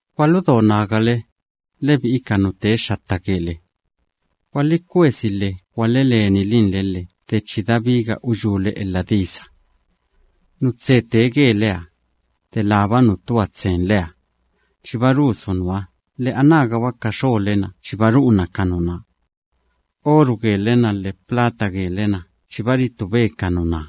Gwaludo nagale, lebi'i ka nu tee xxatta gele. Gwalikwesi lhe gwaleleninle lhe de chi dabiga uyúle elha disa. Nu tse tee geleha, delába nu tua tsenleha, chiba rusu nuha lhe anágaba ka xole‑na chiba ru'una ka nuná. Oru gele‑na lhe plata gele‑na chiba ritube ka nuná.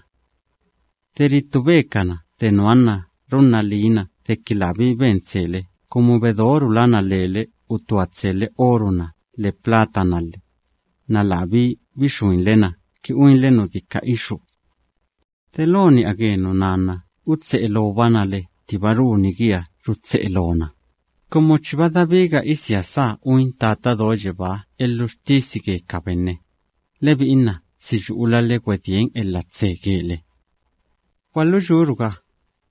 De ritubekana de nuha nna runna liina deki labí ben tsele kumu bedorulana lele utua tsele oru‑na lhe plata‑na lhe, nna labí bixuinle na ki uinle nu dika ixú. De lo ni'a ge nuná nna utse'e loobana le ttiba runi giha rutse'e loona, kumu chiba dabiga isia sá uin Tata Do Yebáha elhuxtisi ge ka benne, lebi'i nna si yu'ulale gwedien elha tse gele. Gwaluyúruga,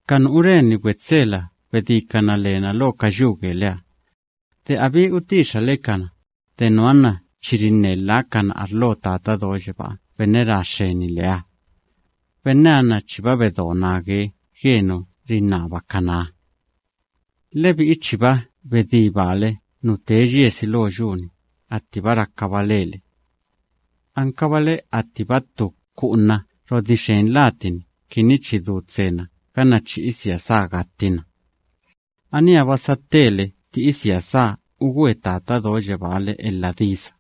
ka nu ureni gwetselaha bedíkana lena lo ka yu geleha. De abittu utixale kana, de nuha nna chi rinne lhákana arlo Tata Do Yebáha benne ra xxeni leha. Benneha nna chiba bedo nage ge nu rinnabakanaha. Lebi'i chiba bedí baale nu tee yiesi lo yu‑ni attiba rakaba lele. Ankabale attiba ttu ku'una rodixen latini kini chi du tsena ganna chi isia sá gattina. Aníha‑ba satele tti isia sá ugwe Tata Do Yebáha le elha disa.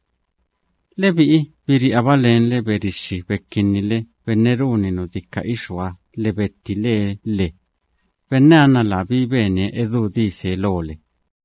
Lebi'i biri'aba lenle berixxi bekinnile benne runi nu dika ixúha lhe bettilee lhe. Benneha nna labí benie edú dise lole.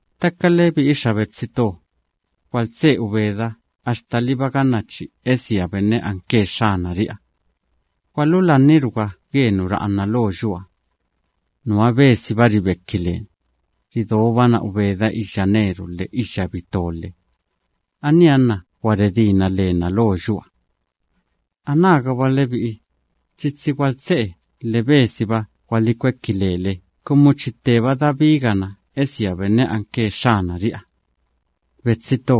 Ttaka lebi'i xa betsi to, gwaltse'e ubeda axtaliba ganna chi esia benne anke Xxanari'iha. Gwalulanniruga ge nu ra'ana lo yuha. Nuha besiba ribeki leni, ridobana ubeda iyya neru lhe iyya bito lhe. Aníha nna gwa redíbana lena lo yuha. Anágaba lebi'i, tsitsi gwaltse'e lhe besiba gwalikweki lele kumu chi tteba dabigana esia Benne anke Xxanari'iha. Betsi to,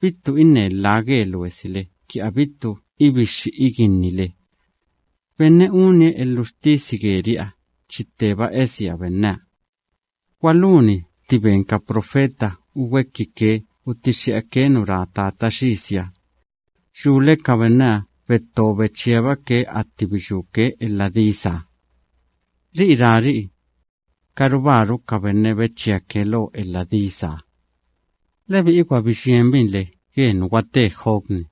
bittu inne lha ge luesile kini abittu ibixxi iginnile. Benne unie elhuxtisi geri'iha chi tteba esia Benneha. Gwaluni tti ben ka profeta ugwekike utixxi'ake nu ra Tata Xisiha. Yule ka benneha betto bechíabake atti biyúke elha disaha. Ri'i rari'i: “Karubáru ka benne bechíake lo elha disaha.” Lebi'i gwa biyienibinle ge nu gwate Job‑ni.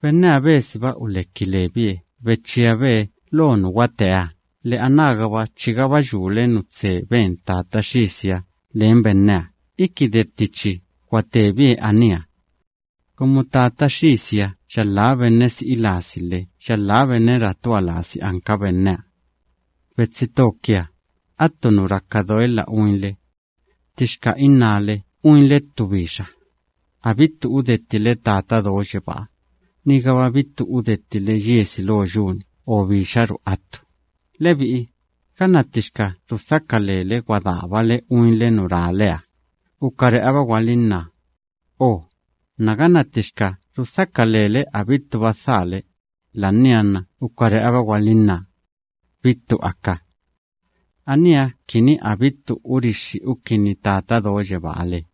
Benneha besiba uleki lebie, bechíabe lo nu gwateeha lhe anágaba chigaba yule nu tse ben Tata Xisiha len benneha iki de tti chi gwatebie aníha. Kumu Tata Xisiha yalhá benne si'i lasi lhe yalhá benne ratua lasi anka benneha. Betsi to kia, attu nu raka doelha uinle: ttixka innále uinle ttu bixa, abittu udettile Tata Do Yebáha, nigaba a udettile yiesi lo yu‑ni o bixaru attu. Lebi'i, ganna ttixka rudhaka lele gwadaabale uinle nu raleha, ukare'aba gwalinná: “O” nna ganna ttixka rudhaka lele abittuba dhaale, la'ania nna ukare'aba gwalinná: “Bittu aka.” Aníha kini abittu urixxi ukinni Tata Do Yebáha le.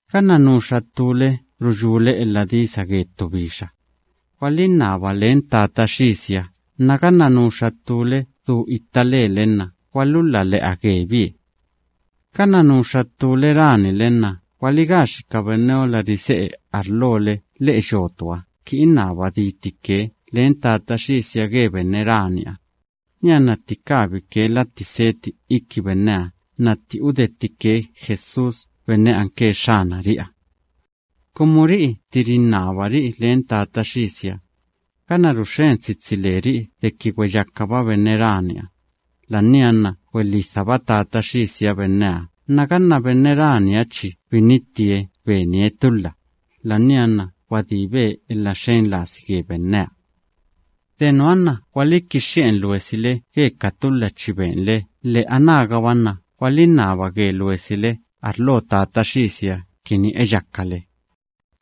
Ganna nuxa ttúle ruyúle elha disa ge ttu bixa, gwalinnaba len Tata Xisiha nna ganna nuxa ttúle du itta lele nna gwalulhala le'a gebie. Ganna nuxa ttúle ranile nna gwaligaxi ka benneola rise'e arlole lhe'e yotuha kini innaba ditike len Tata Xisiha ge benne raniha, nianna tti kabike latti seti iki benneha nna tti udettike Jesús benne anke Xxanari'iha. Kumu ri'i tti rinnabari'i len Tata Xisiha, ganna ruxxen tsitsi leri'i deki gweyakaba benne raniha, la'ania nna gwelhidhaba Tata Xisiha benneha nna ganna benne raniha chi binittie benie tulha, la'ania nna gwadíbe elha xen lasi ge benneha. De nuha nna gwalikixxi'en luesile ge ka tulha chi benle lhe anágaba nna gwalinnaba ge luesile arlo Tata Xisiha kini eyakale.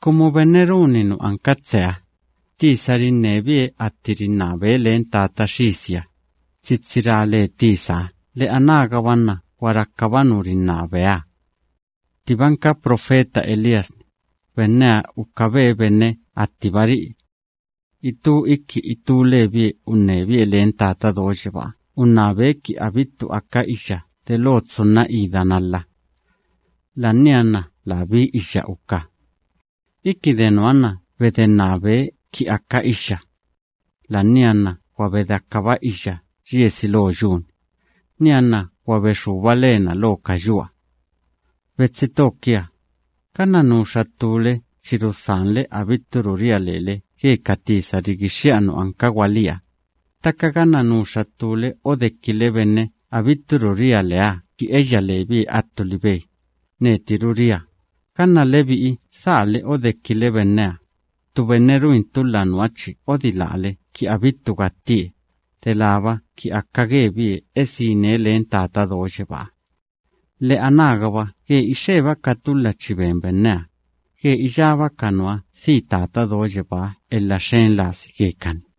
Kumu benne runi nu anka tseha, tisa rinnebie atti rinnabe len Tata Xisiha, tsitsi ra le tisaha lhe anágaba nna gwa rakaba nu rinnabeha. Ttibanka profeta Elías‑ni, benneha ukabe benne attiba ri'i. Itú iki itú lebie unnebie len Tata Do Yebáha unnabe ki abittu aka iyya delo tsunna ida nalhaha. La'ania nna labí iyya uka. Iki de nuha nna bedennabe kini aka iyya. La'ania nna gwa bedeakaba iyya yiesi lo yu‑ni, nianna gwa bexúba lena lo ka yuha. Betsi to kia, ganna nuxa ttúle chi rudhanle abitturu ria lele ge ka tisa rigixxi'a nu anka gwalí, ttaka ganna nuxa ttúle odekile benne abitturu ria leeha ki eyya lebie attu libe, netiru ria, ganna lebi'i dhaale odekile benneha, ttu benne ruin tulha nuha chi odilále kini abittu gattie, delába ki aka gebie esine len Tata Do Yebáha. Lhe anágaba ge ixeba ka tulha chi ben benneha, ge iyába ka nuha dhi Tata Do Yebáha elha xen lasi gekani.